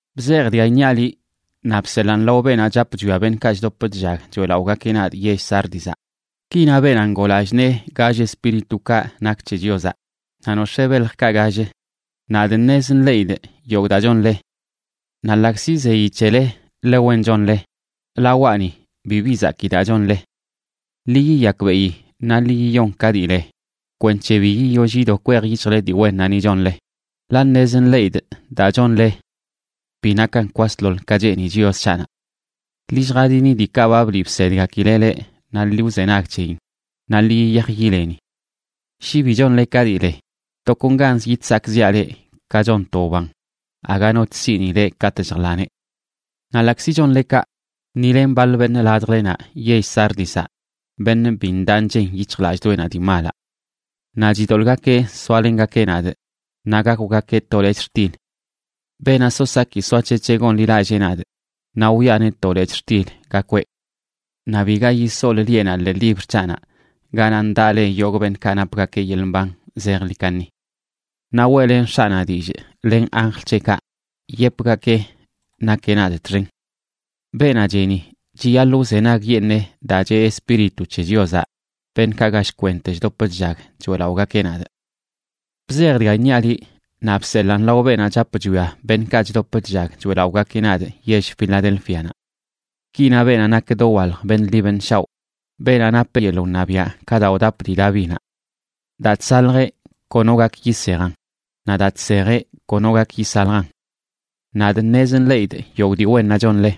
’Bzej dga iṉiaꞌ liꞌ naꞌ bseḻaan lao beenaꞌ chap chwia beṉꞌkaꞌ chdop chllag choeꞌlaꞌogakeꞌ nadꞌ yell Sárdizaꞌ: “Ki na beenaꞌ ngoo lallꞌ nee gall espíritukaꞌ nak c̱he Chiozaꞌ naꞌ nox̱ee beljkaꞌ gall: Nadꞌ ṉez nḻeꞌidꞌ yogꞌ daa chonle. Naꞌ ḻaꞌkzi zeyi c̱hele ḻe wen chonle, lawaꞌni bibi zakii daa chonle. Ḻi yiyakbeꞌi, naꞌ ḻi yiyon ka dii le kwenc̱he bi yiyoll yido kwej yic̱hjle dii wennaꞌ ni chonle. Ḻaꞌ ṉez nḻeꞌidꞌ daa chonle bi nakan kwasḻoḻ ka cheeni Chios c̱haꞌnaꞌ. Ḻi lljadini diikaꞌ ba bliꞌ bsedgakileꞌ leꞌ naꞌ ḻi wzenag c̱heyin, naꞌ ḻi yiyaj yileni. Shi bi chonle ka dii le, tokonganzə yidsakꞌziꞌa leꞌ, ka chon to wban aga no chsiꞌnileꞌ katꞌ chjḻaneꞌ. Naꞌ ḻaꞌkzi chonle kaꞌ, ni len baḻ beṉꞌ ladjlenaꞌ yell Sárdizaꞌ beṉꞌ bi ndaꞌ nchen yic̱hjlallꞌdoꞌenaꞌ dii malaꞌ. Naꞌ chidoḻꞌgakeꞌ soalengakeꞌ nadꞌ naꞌ gakwgakeꞌ to lechꞌ xtil. Beenaꞌ so saki soac̱hec̱heꞌ gonḻilallee nadꞌ, naꞌ wiꞌaneꞌ to lechꞌ xtil gakweꞌ. Naꞌ biga yisolꞌ lieꞌnaꞌ ḻee libr c̱haꞌnaꞌ ganaꞌ ndaꞌ le yogꞌ beṉꞌkaꞌ napgakeꞌ yeḻꞌ mban zejḻi kaṉi. Naꞌ weꞌlenꞌ X̱aꞌnaꞌ dillꞌ len anjl c̱heꞌkaꞌ, yepgakee nakeꞌ nadꞌ txen. Beenaꞌ cheni, chiyaḻꞌ wzenagyeṉee daa cheꞌ Espíritu c̱he Chiozaꞌ beṉꞌkaꞌ gall kwente chdop chllag choeꞌlaꞌogakeꞌ nadꞌ.” ’Bzej dga iṉiaꞌ liꞌ naꞌ bseḻaan lao beenaꞌ chap chwia beṉꞌkaꞌ chdop chllag choeꞌlaꞌogakeꞌ nadꞌ yell Filadélfianaꞌ: “Ki na beenaꞌ nak dowalj beṉꞌ ḻi beṉꞌ shaoꞌ, beenaꞌ nap yeḻꞌ wṉabiaꞌ ka daa wdap dii Davinaꞌ. Daa chsaljeꞌ, kono gak yisejan, naꞌ daa chsejeꞌ, kono gak yisaljan. Nadꞌ ṉez nḻeꞌidꞌ yogꞌ dii wennaꞌ chonle.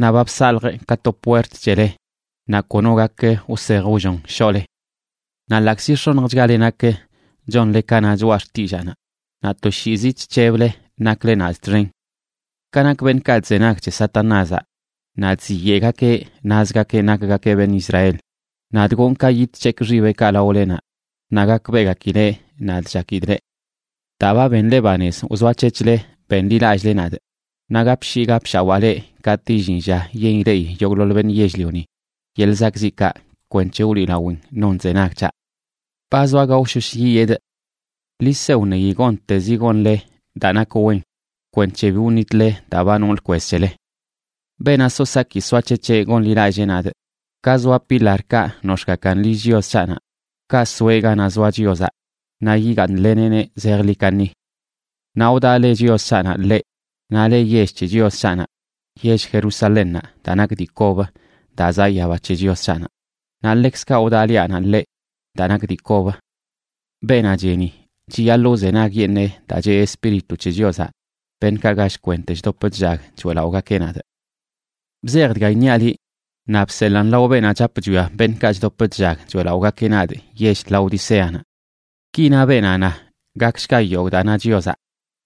Naꞌ ba bsaljꞌ ka to puert c̱hele naꞌ kono gak wsej wllon shoꞌle. Naꞌ ḻaꞌkzi x̱onjchgale nak, chonle ka na choꞌa xtillaanaꞌ naꞌ toshiizi chc̱heble nakle nadꞌ txen. Ka nak beṉꞌkaꞌ chzenag c̱he Satanázaꞌ naꞌ chziyeꞌgakeꞌ nazgakeꞌ nakgakeꞌ beṉꞌ Israel, nadꞌ gonꞌ ka yidc̱hekꞌ xibeꞌkaꞌ laolenaꞌ naꞌ gakbeꞌgakileꞌ nadꞌ chakidꞌ leꞌ. Daa ba benle banez wzoac̱hec̱hle benḻilallꞌle nadꞌ, naꞌ gapshii gapshawaa leꞌ katꞌ illin lla yen ileꞌi yogꞌḻoḻ beṉꞌ yell-lioni yeḻꞌ zakꞌziꞌkaꞌ kwenc̱he wliꞌlawin non chzenag c̱haꞌ. Ba zoa gaoshosh yiyedꞌ. Ḻi se wṉeyi gontezi gonle daa nak wen kwenc̱he bi wnitle daa ba nonꞌ lkwez c̱hele. Beenaꞌ so saki soac̱hec̱heꞌ gonḻilallee nadꞌ, ka zoa pilarkaꞌ nox̱ꞌgakan lill Chios c̱haꞌnaꞌ, kaꞌ soeꞌ ganaꞌ zoa Chiozaꞌ naꞌ yigaaṉleneꞌneꞌ zejḻi kaṉi. Naꞌ wdaꞌ le Chios c̱haꞌnaꞌ ḻeꞌ, naꞌ le yell c̱he Chios c̱haꞌnaꞌ, yell Jerusalénnaꞌ daa nak dii kob daa zaꞌ yaba c̱he Chios c̱haꞌnaꞌ, naꞌ ḻekzkaꞌ wdaꞌ liaꞌnaꞌ ḻeꞌ daa nak dii kob. Beenaꞌ cheni, chiyaḻꞌ wzenagyeṉee daa cheꞌ Espíritu c̱he Chiozaꞌ beṉꞌkaꞌ gall kwente chdop chllag choeꞌlaꞌogakeꞌ nadꞌ.” ’Bzej dga iṉiaꞌ liꞌ naꞌ bseḻaan lao beenaꞌ chap chwia beṉꞌkaꞌ chdop chllag choeꞌlaꞌogakeꞌ nadꞌ yell Laodicéanaꞌ: “Ki na beenaꞌ na gakshga yogꞌ daa na Chiozaꞌ,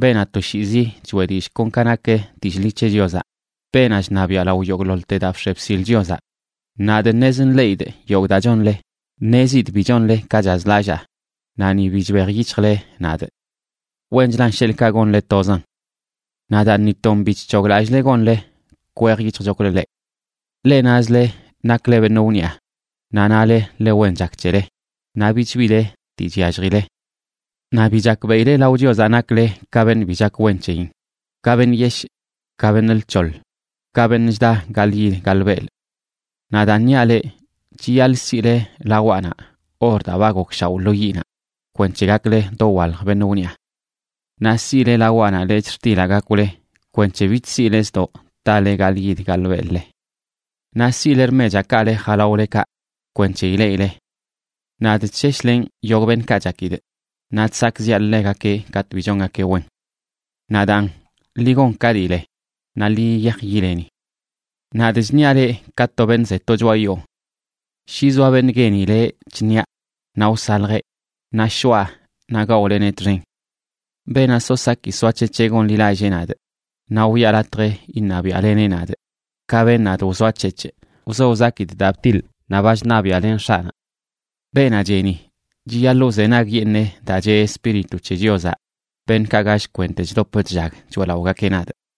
beenaꞌ toshiizi choeꞌ dillꞌ kon ka nak dillꞌ ḻi c̱he Chiozaꞌ, beenaꞌ chṉabiaꞌ lao yogꞌḻoḻte daa bx̱e bsil Chiozaꞌ: Nadꞌ ṉez nḻeꞌidꞌ yogꞌ daa chonle, ṉezidꞌ bi chonle ka chazlallaa naꞌ ni bi chbej yic̱hjle nadꞌ. Wenchlan sheḻꞌkaꞌ gonle tozan. Naꞌ daa ni ton bi chc̱hoglallꞌle gonle, kwejyic̱hjchoklꞌ leꞌ. Leꞌ nazle nakle beṉꞌ wniꞌa, naꞌ nale ḻe wen chak c̱hele naꞌ bich bi de dii chyalljile. Naꞌ bi chakbeꞌile lao Chiozaꞌ nakle ka beṉꞌ bi chak wen c̱heyin, ka beṉꞌ yeshꞌ, ka beṉꞌ lc̱hoḻ, ka beṉꞌ chda gaḻꞌyid gaḻꞌbelꞌ. Naꞌ daan, niaꞌ leꞌ chiyaḻꞌ siꞌle lawaꞌnaꞌ or daa ba gokshaoꞌ lo yiꞌnaꞌ, kwenc̱he gakle dowalj beṉꞌ wniꞌa; naꞌ siꞌle lawaꞌnaꞌ lechꞌ xtilaꞌ gakwle kwenc̱he bich siꞌle ztoꞌ tale gaḻꞌyid galꞌbelꞌle; naꞌ siꞌleꞌ rmechaꞌ kaale jalaolekaꞌ kwenc̱he ileꞌile. Nadꞌ chsheshlenꞌ yogꞌ beṉꞌkaꞌ chakidꞌ, naꞌ chsakꞌziꞌa ḻegakeꞌ katꞌ bi chongakeꞌ wen. Naꞌ daan, ḻi gon ka dii le, naꞌ ḻi yiyaj yileni. Nadꞌ chṉiaꞌ leꞌ ka to beṉꞌ ze to choꞌa yoo. Shi zoa beṉꞌ guenileꞌ chṉiaꞌ naꞌ wsaljeꞌ, naꞌ shoꞌa naꞌ gaolenee txen. Beenaꞌ so saki soac̱hec̱heꞌ gonḻilallee nadꞌ, naꞌ wiꞌa latj iṉabiaꞌleneꞌ nadꞌ, ka benꞌ nadꞌ, wzoac̱hec̱hꞌ wzo wzakidꞌ daa btiḻꞌ naꞌ ba chṉabiaꞌlenꞌ X̱aꞌnaꞌ. Beenaꞌ cheni, chiyaḻꞌ wzenagyeṉee daa cheꞌ Espíritu c̱he Chiozaꞌ beṉꞌkaꞌ gall kwente chdop chllag choeꞌlaꞌogakeꞌ nadꞌ.”